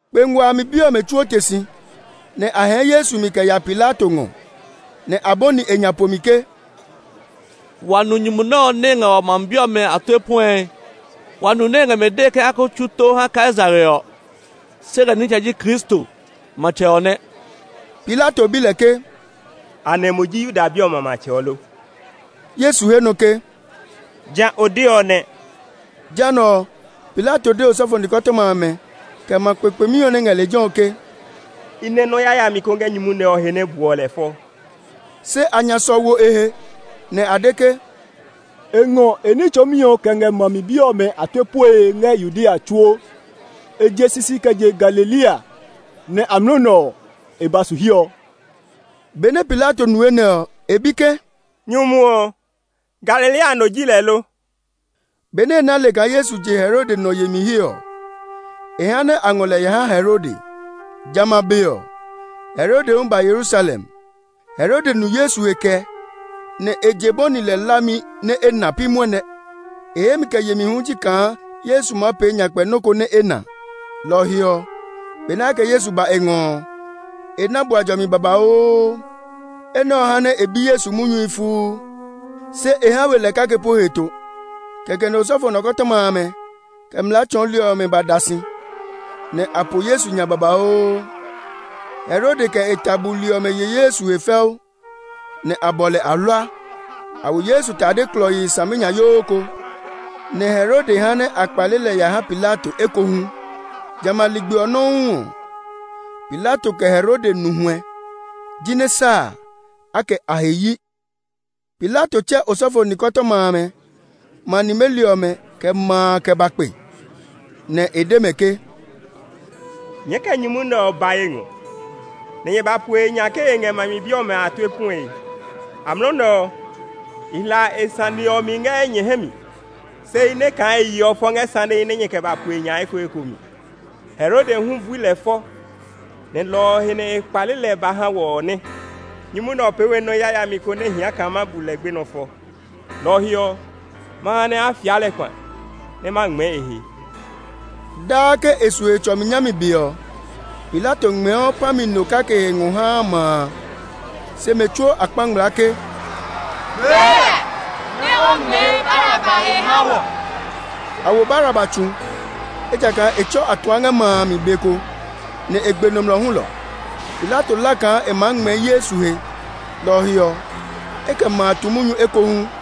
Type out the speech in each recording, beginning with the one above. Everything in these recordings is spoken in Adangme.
Kpe nguaa a mi bi ɔmɛ tsuo te si, nɛ a hɛɛ Yesu mi kɛ ya Pilato ngɔ. Nɛ a bɔni e nya pomi ke, “Wa nu nyumu nɛ ɔ nɛ e ngɛ wa ma mi bi ɔmɛ a tue puɛe. Wa nu nɛ e ngɛ mɛ dee ke a ko tsu tó ha Kaisare ɔ, se lɛ nitsɛ ji Kristo, matsɛ ɔ nɛ.” Pilato bi lɛ ke, “Anɛ mo ji Yuda bi ɔmɛ a matsɛ ɔ lo?” Yesu he nɔ ke, “Ja o deɔ nɛ.” Jehanɛ ɔ, Pilato de osɔfo nikɔtɔma amɛ, kɛ ma kpekpemi ɔ nɛ ngɛ lejɛ ɔ ke, “I nɛ nɔ́ yayami ko ngɛ nyumu nɛ ɔ he nɛ buɔ lɛ fɔ.” Se a nya sɔ wo e he, nɛ a de ke, “E ngɔ e ní tsɔɔmi ɔ kɛ ngɛ ma mi bi ɔmɛ a tue puɛe ngɛ Yudea tsuo. E je sisi kɛ je Galilea, nɛ amlɔ nɛ ɔ, e ba su hiɛ ɔ.” Benɛ Pilato nu enɛ ɔ, e bi ke, “Nyumu ɔ, Galilea no ji lɛ lo?” Benɛ e na le kaa Yesu je Herode nɔ yemi he ɔ, e ha nɛ a ngɔ lɛ ya ha Herode. Jamɛ a be ɔ, Herode hu ba Yerusalem. Herode nu Yesu he kɛ, nɛ e je bɔni lɛ hlami nɛ e na pi mwɔnɛ. E hemi kɛ yemi hu ji kaa Yesu maa pee nyakpɛ nɔ́ ko nɛ e na. Lɔ ɔ he ɔ, benɛ a kɛ Yesu ba e ngɔ ɔ, e na bua jɔmi babauu. Enɛ ɔ ha nɛ e bi Yesu munyuhi fuu, se e ha we lɛ kake po heto. Kɛkɛ nɛ osɔfo nikɔtɔma amɛ, kɛ mlaa tsɔɔli ɔmɛ ba da si, nɛ a po Yesu nya babauu. Herode kɛ e ta buli ɔmɛ ye Yesu he fɛu, nɛ a bɔ lɛ ahlua. A wo Yesu tade klɔii saminyayoo ko, nɛ Herode ha nɛ a kpale lɛ ya ha Pilato ekohu. Jamɛ a ligbi ɔ nɔuu ɔ, Pilato kɛ Herode nu huɛ; jinɛ sa a, a kɛ a he yi. Pilato tsɛ osɔfo nikɔtɔma amɛ, ma nimeli ɔmɛ, kɛ ma a kɛ ba kpe, nɛ e de mɛ ke, “Nyɛɛ kɛ nyumu nɛ ɔ ba ye ngɔ, nɛ nyɛ ba po e nya ke e ngɛ ma mi bi ɔmɛ a tue puɛe. Amlɔ nɛ ɔ, i hla e sane ɔ mi ngɛ nyɛ hɛ mi, se i nɛ kaa e yeɔ fɔ ngɛ sanehi nɛ nyɛ kɛ ba po e nya a ekoeko mi. Herode hu bui lɛ fɔ, nɛ lɔ ɔ he nɛ e kpale lɛ ba ha wɔ ɔ nɛ. Nyumu nɛ ɔ pee we nɔ́ yayami ko nɛ hia kaa ma bu lɛ gbenɔ fɔ. Lɔ ɔ he ɔ, ma ha nɛ a fia lɛ kpa, nɛ ma ngmɛɛ e he.” [ Daa ke e su Hetsɔmi nyami be ɔ, Pilato ngmɛɛɔ pã mi no kake he ngɔ haa ma a.] Se mɛ tsuo a kpa ngmlaa ke, “Gbee lɛ, nɛ o ngmɛɛ Baraba he ha wɔ!” (A wo Baraba tsu, ejakaa e tsɔ atuã ngɛ ma a mi be ko, nɛ e gbe nɔmlɔ hulɔ.) Pilato hla kaa e maa ngmɛɛ Yesu he, lɔ ɔ he ɔ, e kɛ ma a tu munyu ekohu.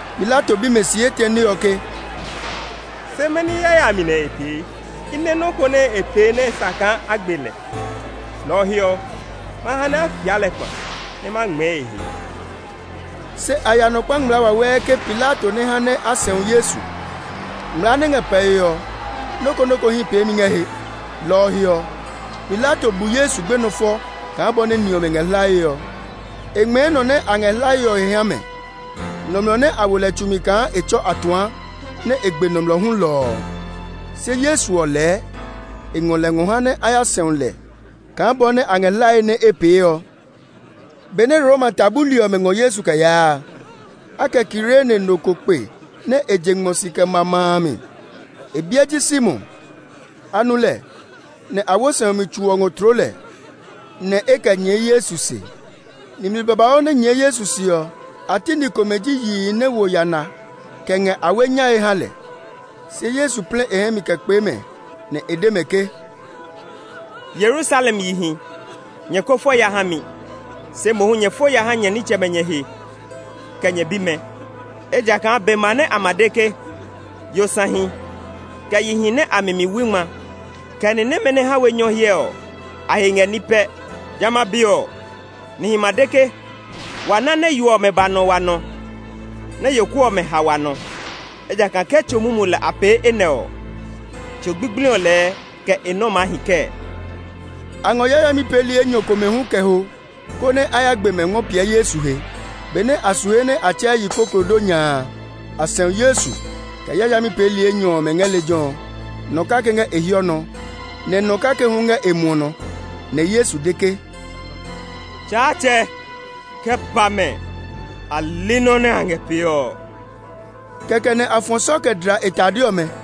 Pilato bi mɛ si etɛne ɔ ke, “Se mɛni yayami nɛ e pee? I nɛ nɔ́ ko nɛ e pee nɛ sa kaa a gbe lɛ. Lɔ ɔ he ɔ, ma ha nɛ a fia lɛ kpa, nɛ ma ngmɛɛ e he.” Se a ya nɔ kpa ngmlaa wawɛɛ ke Pilato nɛ ha nɛ a sɛu Yesu. Ngmlaa nɛ ngɛ pɛe ɔ, nɔ́ ko nɔ́ ko hí peemi ngɛ he. Lɔ ɔ he ɔ, Pilato bu Yesu gbenɔ fɔ kaa bɔ nɛ ni ɔmɛ ngɛ hlae ɔ. E ngmɛɛ nɔ nɛ a ngɛ hlae ɔ he ha mɛ, nɔmlɔ nɛ a wo lɛ tsu kaa e tsɔ atuã, nɛ e gbe nɔmlɔ hulɔ ɔ. Se Yesu ɔ lɛɛ, e ngɔ lɛ ngɔ ha nɛ a ya sɛu lɛ kaa bɔ nɛ a ngɛ hlae nɛ e pee ɔ. Benɛ Roma ta buli ɔmɛ ngɔ Yesu kɛ yaa a, a kɛ Kirene no ko kpe nɛ je ngmɔ si kɛ ma ma a mi. E biɛ ji Simon. A nu lɛ, nɛ a wo sɛumi tso ɔ ngɔ tloo lɛ, nɛ e kɛ nyɛɛ Yesu se. Nimli babauu nɛ nyɛɛ Yesu se ɔ, a ti ni komɛ ji yihi nɛ wo yana kɛ ngɛ awe nyae ha lɛ. Se Yesu plɛ e hɛ mi kɛ kpee mɛ, nɛ e de mɛ ke, “Yerusalem yihi! Nyɛ ko fo ya ha mi; se mohu nyɛ fo ya ha nyɛ nitsɛmɛ nyɛ he, kɛ nyɛ bimɛ. Ejakaa be ma nɛ a ma de ke, ‘Yosahi, kɛ yihi nɛ a mi mi wui ngma, kɛ ni nɛmɛ nɛ ha we nyɔ hyɛ ɔ, a he ngɛ ní pɛ!’ Jamɛ a be ɔ, nihi ma de ke, ‘Wa na nɛ yo ɔmɛ ba nɔ wa nɔ; nɛ yoku ɔmɛ ha wa nɔ.’ Ejakaa ke tso mumu lɛ a pee enɛ ɔ ɔ, tso gbigbli lɛɛ kɛ e nɔ́ maa hi kɛɛ?” A ngɔ yayami peeli enyɔ komɛ hu kɛ ho, konɛ a ya gbe mɛ ngɔ piɛ Yesu he. Benɛ a su he nɛ a tsɛɛ “Yikoklodonya a”, a sɛu Yesu, kɛ yayami peeli enyɔ ɔmɛ ngɛ lejɛ ɔ; nɔ kake ngɛ e hiɔ nɔ, nɛ nɔ kake hu ngɛ e muɔ nɔ. [ Nɛ Yesu de ke, “Tsaatsɛ, kɛ pa mɛ! A li nɔ́ nɛ a ngɛ pee ɔ.” Kɛkɛ nɛ a fɔ sɔ kɛ dla e tade ɔmɛ.]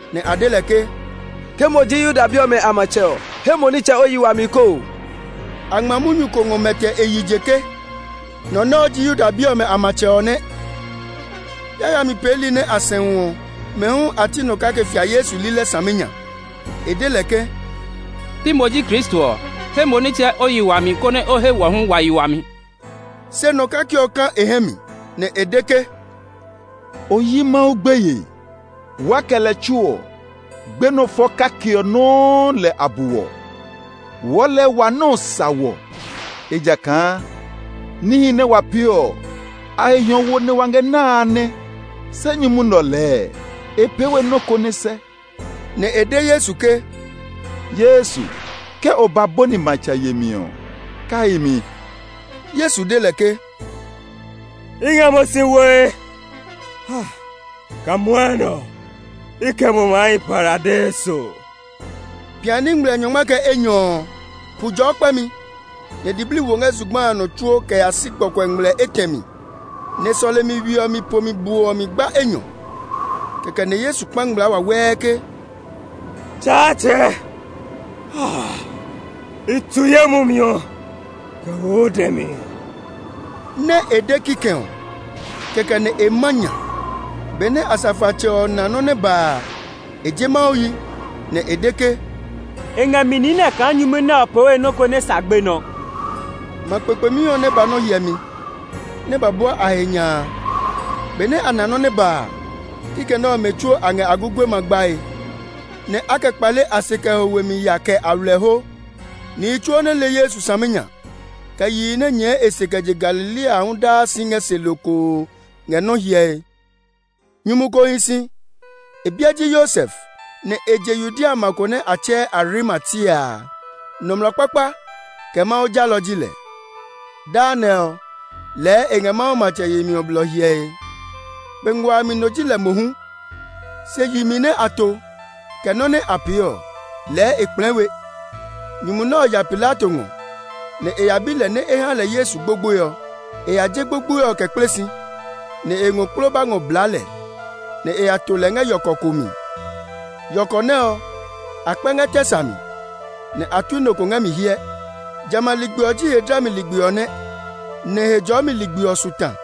nɛ a de lɛ ke, “Ke mo ji Yuda bi ɔmɛ a matsɛ ɔ, he mo nitsɛ o yi wami koo!” A ngma munyu ko ngɔ mɛtɛ e yi je ke, “Nɔ nɛ ɔ ji Yuda bi ɔmɛ a matsɛ ɔ nɛ.” Yayami peeli nɛ a sɛu ɔ, mɛ hu a ti nɔ kake fia Yesu lilɛ saminya. E de lɛ ke, “Pi mo ji Kristo ɔ? He mo nitsɛ o yi wami, konɛ o he wɔ hu wa yi wami!” Se nɔ kake ɔ ka e hɛ mi, nɛ e de ke, “O yi Mawu gbeye? Waa kɛ lɛ tsuo ɔ, gbenɔ fɔ kake ɔ nɔuu lɛ a bu wɔ. Wɔɔ lɛɛ wa nɔ́ ɔ sa wɔ; ejakaa níhi nɛ wa pee ɔ, a he hiɔwo nɛ wa na a nɛ. Se nyumu nɛ ɔ lɛɛ e pee we nɔ́ ko nɛ sɛ.” Nɛ e de Yesu ke, “Yesu, ke o ba bɔni matsɛ yemi ɔ, kai mi!” Yesu de lɛ ke, “I ngɛ mo si woe kaa mwɔnɛ ɔ, i kɛ mo maa hi Paradeiso.” Piani ngmlɛ nyɔngma kɛ enyɔ ɔ, pu jɔɔ kpɛmi, nɛ diblii wo ngɛ zugba a nɔ tsuo kɛ ya si gbɔkuɛ ngmlɛ etɛ mi. Nɛ sɔlemi we ɔ mi pomi bo ɔ mi gba enyɔ. Kɛkɛ nɛ Yesu kpa ngmlaa wawɛɛ ke, “Tsaatsɛ, i tu ye mumi ɔ kɛ wo o dɛ mi!” Nɛ e de kikɛ ɔ, kɛkɛ nɛ e ma nya. Benɛ asafoatsɛ ɔ na nɔ́ nɛ ba a, e je Mawu yi, nɛ e de ke, “E ngɛ mi niinɛ kaa nyumu nɛ ɔ pee we nɔ́ ko nɛ sa gbenɔ!” Ma kpekpemi ɔ nɛ ba nɔ́ hyɛmi, nɛ ba bua a he nya a, benɛ a na nɔ́ nɛ ba a, kikɛ nɛ ɔ mɛ tsuo a ngɛ a gugue ma gbae, nɛ a kɛ kpale a se kɛ ho we mi ya kɛ aywilɛho. Nihi tsuo nɛ le Yesu saminya, kɛ yihi nɛ nyɛɛ e se kɛ je Galilea a hu daa si ngɛ se lokoo ngɛ nɔ́ hyɛe. Nyumu ko hi si. E biɛ ji Yosef, nɛ e je Yudea ma ko nɛ a tsɛɛ Arimatia a. Nɔmlɔ kpakpa, kɛ Mawu jalɔ ji lɛ. Daa nɛ ɔ, lɛɛ e ngɛ Mawu matsɛ yemi ɔ blɔ hyɛe. Kpe nguaa a mi no ji lɛ mohu, se yi mi nɛ a to, kɛ nɔ́ nɛ a pee ɔ, lɛɛ e kplɛɛ we. Nyumu nɛ ɔ ya Pilato ngɔ, nɛ e ya bi lɛ nɛ e ha lɛ Yesu gbogboe ɔ. E ya je gbogboe ɔ kɛ kple si, nɛ e ngɔ kploba ngɔ blaa lɛ, nɛ e ya to lɛ ngɛ yɔkɔ ko mi. Yɔkɔ nɛ ɔ, a kpɛ ngɛ tɛ sa mi, nɛ a tui nɔ ngɛ mi hyɛ. Jamɛ a ligbi ɔ ji he dlami ligbi ɔ nɛ, nɛ Hejɔɔmi ligbi ɔ su ta.